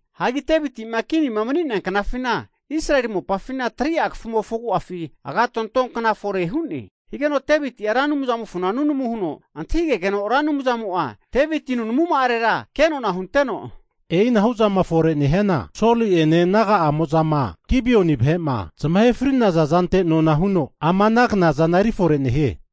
Hagi Deviti'ma kini mani'nea knafina, Israeli mopafina 3'a kafumofo agu'afi agatonto kna fore hu'ne. Higeno Deviti'a Ra Anumzamofona nunama huno antahigegeno, Ra Anumzamo'a Deviti nunamuma'arera kenona hunteno, e'inahu zama fore nehiana Soli'ene naga'amo'zama Gibioni vahe'ma zamahe fri'naza zante nona huno ama ana knazana efore nehie.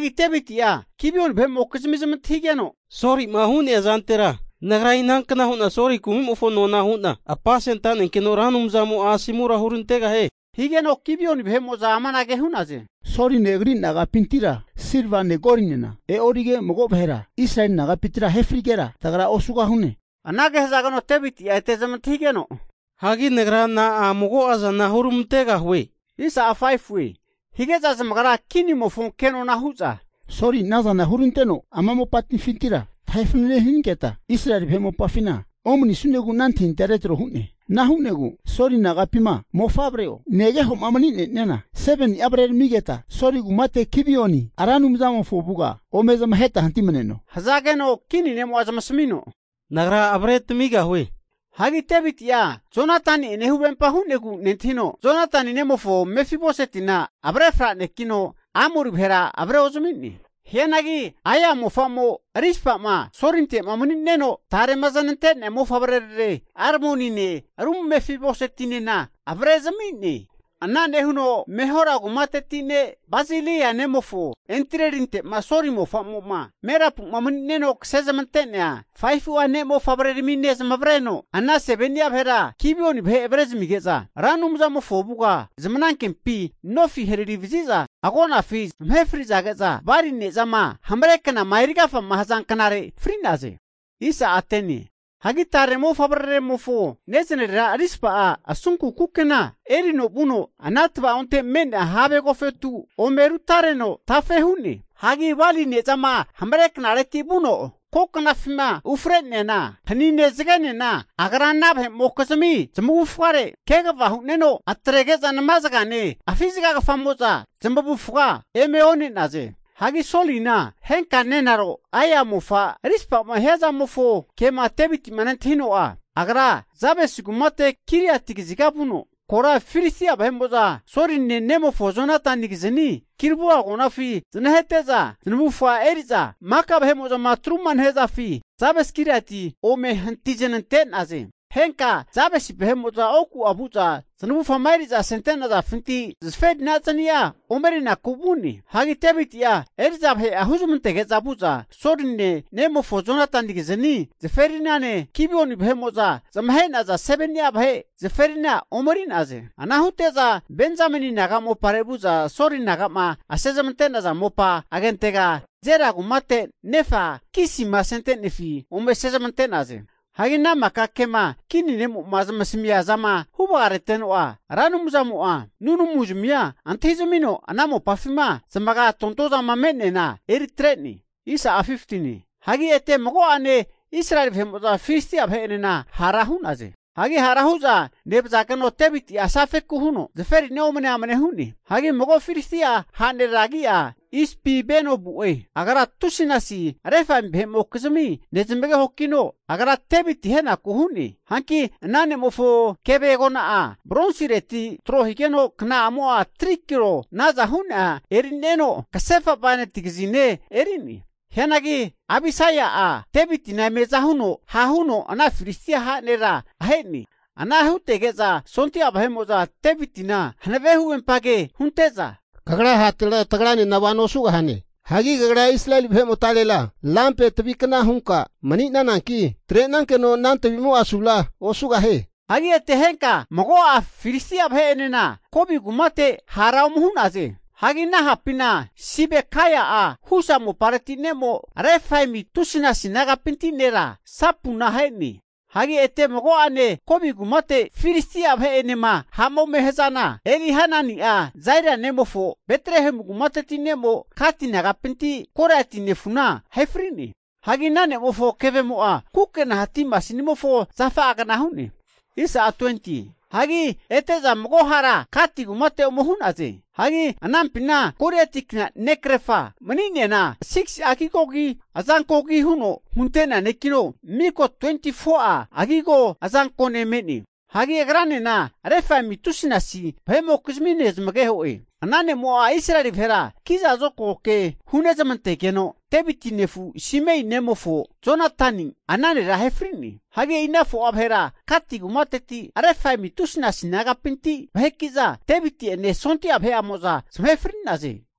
Hagi Deviti'a Gibioni vahe'mokizmia zamantahigeno, Soli'ma hu'nea zantera nagra inankna hu'na Soli kumimofo nona hu'na apasentanenkeno Ra Anumzamo'a asomura hurantegahie? Higeno Gibioni vahe'mo'za amanage hu'naze, Soline agri nagapintira silvane golinena e'orige mago vahera Israeli nagapintira ahe frigera tagra osugahune. Anage hazageno Deviti'a ete zamantahigeno, Hagi nagra na'a mago'a zana huramantegahue? Hige'za zamagra kinimofo kenona hu'za, Soli ana zana huranteno ama mopafintira tahe fanene hanigeta Israeli vahe mopafina omanisunegu ana antahintahia retro hu'ne. Ana hu'negu Soli nagapima mofavre'o, negeho'ma mani'ne'niana 7ni'a avreramigeta, Soli kumate Gibioni Ra Anumzamofo avuga ome zamaheta hantimaneno. Hazageno kini ne'mo'a zamasamino, Nagra avre tamigahue. Hagi Deviti'a Jonatani'ene huvempa hu'negu nentahino, Jonatani ne'mofo Mefi-boseti'na avre franekino Amori vahera avre ozami'ne. Hianagi Aia mofa Rispama Solinte'ma mani'neno, tarema zanante'nea mofavrerare Armonine ru Mefibosetinena avre'zami'ne. Ana nehuno Mehola kumateti ne' Barzilai nemofo Adrielinte'ma Soli mofamo'ma Merabu'ma mani'neno kasezmante'nea 5fua ne' mofavreramine zamavareno, ana 7ni'a vahera Gibioni vahera avrezamige'za, Ra Anumzamofo avuga zamanankempi nofi hararivazi'za agonafi zamahe fri'zage'za, bali ne'zama hamare knama erigafa haza knare fri'naze. Hagi tare mofavreraremofo nezanarera Rispa'a asunku kukena erino vuno ana tva'onte me'nea have agofetu ome rutareno tafe hu'ne. Hagi bali ne'zama hamare knareti vuno ko knafima ufre'neana hanine zagenena agra ana vahe'mokizmi zmavufare kegava hu'neno, atrege'za namazagane afi zagagafamo'za zamavufaga eme one'naze. Hagi Solina henka nenaro Aia mofa Rizpama hiazamofo kema Devitima nentahino'a, agra Jabase kumate Giliati kaziga vuno, kora Filistia vahe'mo'za Soline nemofo Jonatanigizani Gilboa agonafi znahete'za, zanavufga eri'za maka vahe'mo'zama atruma nehazafi Jabes-Giliati ome hanti znante'naze. Henka Jabesi vahe'mo'za oku'a vu'za zanavufama ome eri'za asente'nafinti zaferina zani'a omerinaku vu'ne. Hagi Deviti'a eri'za vahe'a huzmantege'za vu'za, Soline nemofo Jonatanigizni zaferinane, Gibioni vahe'mo'za zamahe'naza 7ni'a vahe zaferina omeri'naze. Ana hute'za Benzameni naga mopare vu'za Soli naga'ma asezmante'naza mopa agentega Zela kumate nefa Kisima asente'nefi ome asezmante'naze. Hagi ana maka kema kini ne'mo'ma zamasamia zama huvarageno'a, Ra Anumzamo'a nunamuzamia antahizamino, ana mopafima zamaga tontozama me'neana eri atre'ne. Hagi ete mago'ane Israeli vahe'mo'za Filistia vahe'enena hara hu'naze. Hagi hara hu'za nevazageno, Deviti'a asafeku huno zaferina omne amne hu'ne. Hagi mago Filistia ha' nera agi'a Isbibenobu'e. Agra tusinasi Refaimi vahe'mokizmi nezamagehokino, agra Deviti ahenaku hu'ne. Hanki ana ne'mofo keve agona'a bronsireti tro higeno, kna'amo'a 3kilo naza hu'nea eri'neno, kasefa bainati kazine eri'ne. Hianagi Abisaia'a Devitina eme aza huno ha' huno ana Filistia ha' nera ahe'ne. Ana hutege'za sondia vahe'mo'za Devitina hanave huvempa ke hunte'za, kagra hatera tagranena vano osugahane. Hagi kagra Israeli vahe'motarera lampe tavi kna hunka mani'nananki, atre'nankeno ana tavimo'a asura osugahie. Hagi ete henka mago Filistia vahe'enena Gobi kumate hara ome hu'naze. Hagi ana hapina Sibekai'a, Husa mopareti ne'mo, Refaimi tusinasi nagapinti nera Sapuna ahe'ne. Hagi ete mago'ane Gobi kumate Filistia vahe'enema ha'ma ome hazana, Elihanani'a Zaeli nemofo Betlehemu kumateti ne'mo Gati nagapinti Goliati nefuna ahe fri'ne. Hagi ana nemofo kevemo'a kukena hati masinimofo zafa'agna hu'ne. Hagi ete'za mago hara Gati kumate ome hu'naze. Hagi anampina Goliati kna ne' krefa mani'neana 6'a agigogi, azankogi huno hunte'neankino miko 24'a agigo azankone me'ne. Hagi agranena Refaimi tusinasi vahe'mokizmi nezmageho'e. Ana ne'mo'a Israeli vahera kiza zokago ke hunezamantegeno, Deviti nefu Simei nemofo Jonatani ana nera ahe fri'ne. Hagi e'i ana 4'a vahera Gati kumateti Refaimi tusinasi nagapinti vaheki'za Deviti'ene, sondia vahe'amo'za zamahe fri'naze.